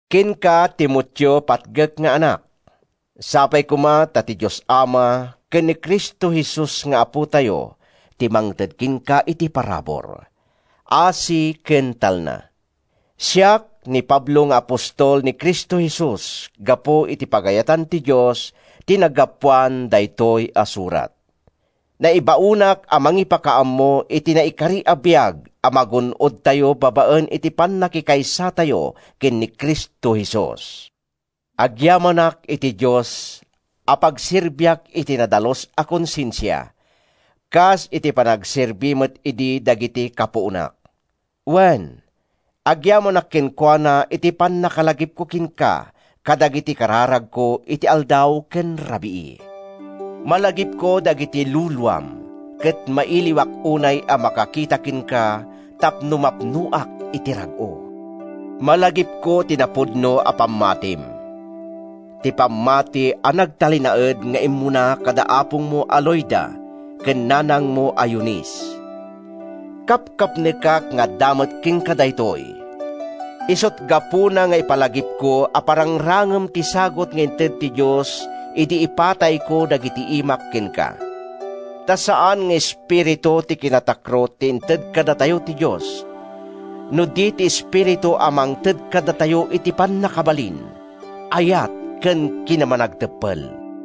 Kenka, Timoteo a patgek nga anak, Sapay koma ta ti Dios Ama ken ni Cristo Jesus nga Apotayo ti mangted kenka iti parabur, asi ken talna. Siak, ni Pablo nga apostol ni Cristo Jesus gapu iti pagayatan ti Dios, ti naggapuan daytoy a surat. Naibaonak a mangipakaammo iti naikari a biag a magun-odtayo babaen iti pannakikaysatayo ken ni Cristo Jesus. Agyamanak iti Dios a pagserbiak iti nadalus a konsensia, kas iti panagserbi met idi dagiti kapuonak. Wen, agyamanak kenkuana iti pannakalagipko kenka kadagiti kararagko iti aldaw ken rabii. Malagipko dagiti luluam ket mailiwak unay a makakita kenka tapno mapnoak iti rag-o. Malagipko ti napudno a pammatim, ti pammati a nagtalinaed nga immuna kada apongmo a Loida ken nanangmo a Eunice. Kapkapnekak nga adda met kenka daytoy. Isut’ gapuna nga ipalagipko a parangrangem ti sagut nga inted ti Dios idi ipatayko dagiti imak kenka. Ta saan nga espiritu ti kinatakrot ti inted kadatayo ti Dios, no di ti Espiritu a mangted kadatayo iti pannakabalin, ayat ken kinamanagteppel.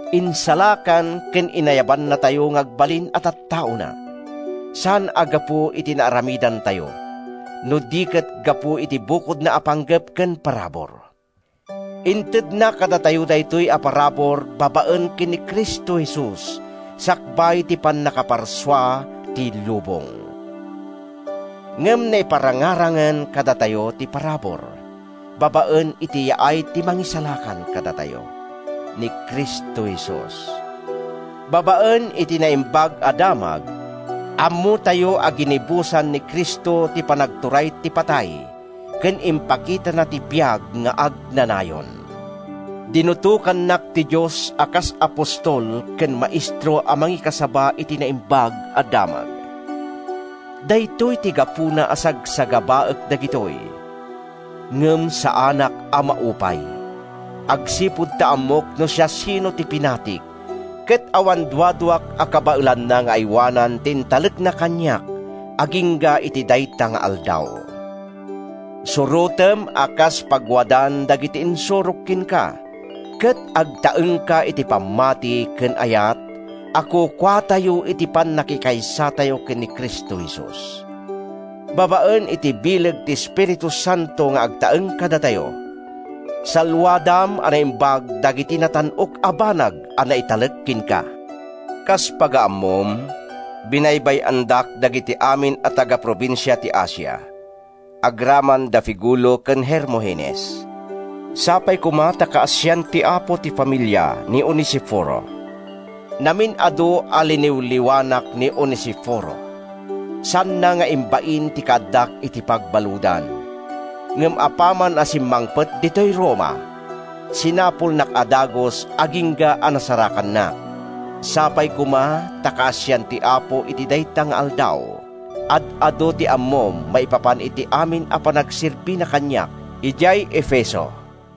Insalakan ken inayabannatayo nga agbalin a tattaona, saan a gapu iti naaramidantayo, no di ket gapu iti bukodna a panggep ken parabur. Intedna kadatayo daytoy a parabur babaen ken ni Cristo Jesus sakbay ti pannakaparsua ti lubong. Ngem naiparangarangen kadatayo ti parabur babaen iti yaay ti Mangisalakan kadatayo, ni Cristo Jesus. Babaen iti Naimbag a Damag, ammotayo a ginibusan ni Cristo ti panagturay ti patay ken impakitana ti biag nga agnanayon. Dinutokannak ti Dios a kas apostol ken maestro a mangikasaba iti Naimbag a Damag. Daytoy ti gapuna a sagsagabaek dagitoy. Ngem saanak a maupay, agsipud ta ammok no siasino ti pinatik ket awan duaduak a kabaelanna nga aywanan ti intalekna kaniak agingga iti dayta nga Aldaw. Surotem a kas pagwadan dagiti insurok kenka, ket agtaengka iti pammati ken ayat a kukuatayo iti pannakikaysatayo ken ni Cristo Jesus. Babaen iti bileg ti Espiritu Santo nga agtaeng kadatayo, salluadam a naimbag dagiti natan-ok a banag a naitalek kenka. Kas pagaammom, binaybay-andak dagiti amin a taga-probinsia ti Asia, agraman da Figelo ken Hermogenes. Sapay koma ta kaasian ti Apo ti familia ni Onesiforo. Namin-adu a liniwliwanak ni Onesiforo. Saanna nga imbain ti kaaddak iti pagbaludan, ngem apaman a simmangpet ditoy Roma, sinapulnak a dagus agingga a nasarakannak. Sapay koma ta kaasian ti Apo iti dayta nga Aldaw! Ad-adu ti ammom maipapan iti amin a panagserbina kaniak idiay Efeso.